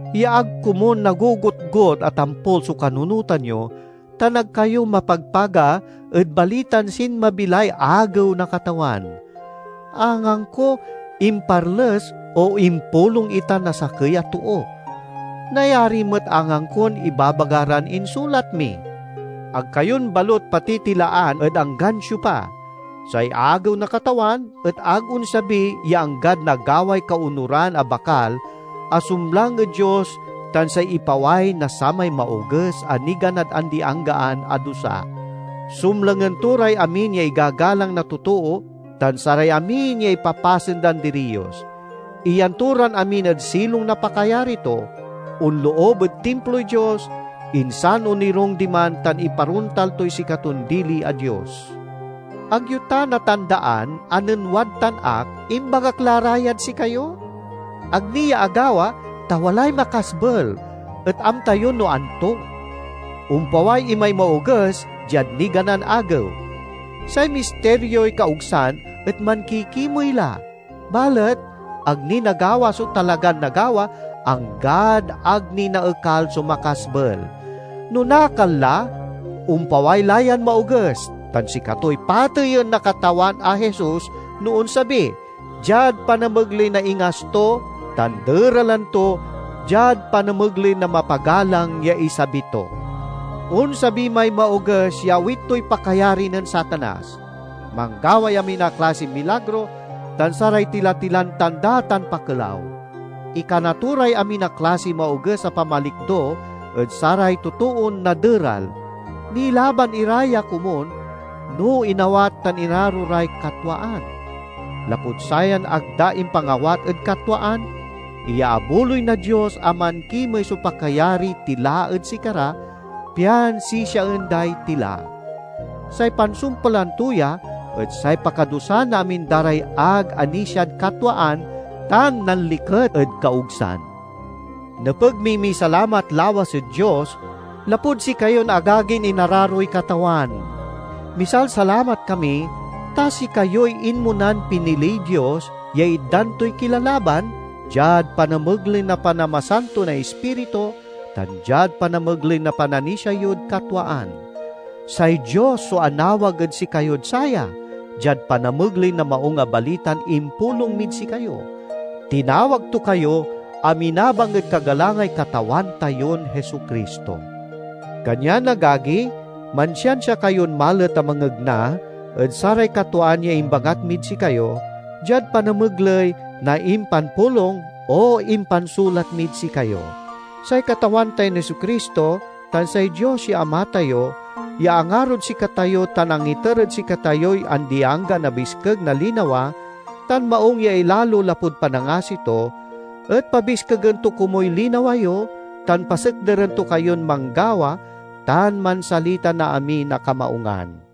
ya ag komun nagogotgot a tampul so kanunotan yo tan ag kayo mapagpaga ed balitan sinmabi lay Agew na Katawan. Angangko imparles, o impulong itan na sakey a too. Nayari met angangkon ibabaga ran insulat mi. Ag kayon balut patitilaan ed anggan siopa. Say Agew na Katawan et ag onsabi ya anggad nagaway kaonuran a Bakal a sumlang ed Dios tan say ipaway na samay Maoges a niganad andi-anggaan a dusa. Sumlangen to ray amin ya igagalang na totoo tan saray amin ya ipapasen dan diriyos. Iyan to ran amin ed silong na pakayari to, onloob ed Timploy Dios, insan onirung diman tan iparontal toy sikaton dili a Dios. Ag yo ta natandaan a nen wadtan ak, imbagak la ra yad sikayo? Ag ni ya agawa ta walay makasbel, et amta yo no anto. Ompaway imay Maoges diad niganan agew. Say Mistirioy Kaogsan et mankikimey la, balet ag ni nagawa so talagan nagawa, anggad ag ni naekal so makasbel. No nakal la, ompaway la yan Maoges, tan sikatoy pateyen na Katawan a Jesus no onsabi, diad panamegley na ingas to, tan deralen to diad panamegley na mapagalang ya isabi to. Onsabi may Maoges ya awit toy pakayari nen Satanas. Manggaway amin a klasiy milagro, tan saray tila-tilan tanda tan pakelaw. Ikana to ray amin a klasiy maoges a pamalikdo ed saray totoon naderal; nilaban ira ya komun no inawat tan inaro ray katwaan. Lapud sayan ag da impangawat ed katwaan, iyaabuloy na Dios a mankimey so pakayariy tila ed sikara, pian sisiaen day tila. Say pansumpalan to ya et say pakadusa na amin da ray ag anisiad katwaan tan nanliket ed kaogsan. Nepeg miy misalamat lawas ed Dios lapud sikayon agagin inararoy Katawan. Misalsalamat kami, ta sikayoy inmonan piniliy Dios ya itdan toy kilalaban, diad panamegley na panamasanto na Ispiritu, tan diad panamegley na pananisia yod katwaan. Say Dios so anawag ed sikayod saya, diad panamegley na Maung a Balitan impulong mid sikayo. Tinawag to kayo a minabang ed kagalangay Katawan tayon Jesu-Cristo. Kanyan agagi, mansiansia kayon malet a mangegna ed saray katwaan ya imbangat mid sikayo, diad panamegley na impanpulong o impansulat mid sikayo. Say Katawan tayon Jesu-Cristo tan say Dios ya Ama tayo ya angarod sikatayo tan angiter ed sikatayoy andi-anggaan a biskeg na linawa tan maung ya ilalo lapud panangasi to, et pabiskegen to komuy linawa yo tan pasekderen to kayon manggawa tan mansalita na amin a kamaungan.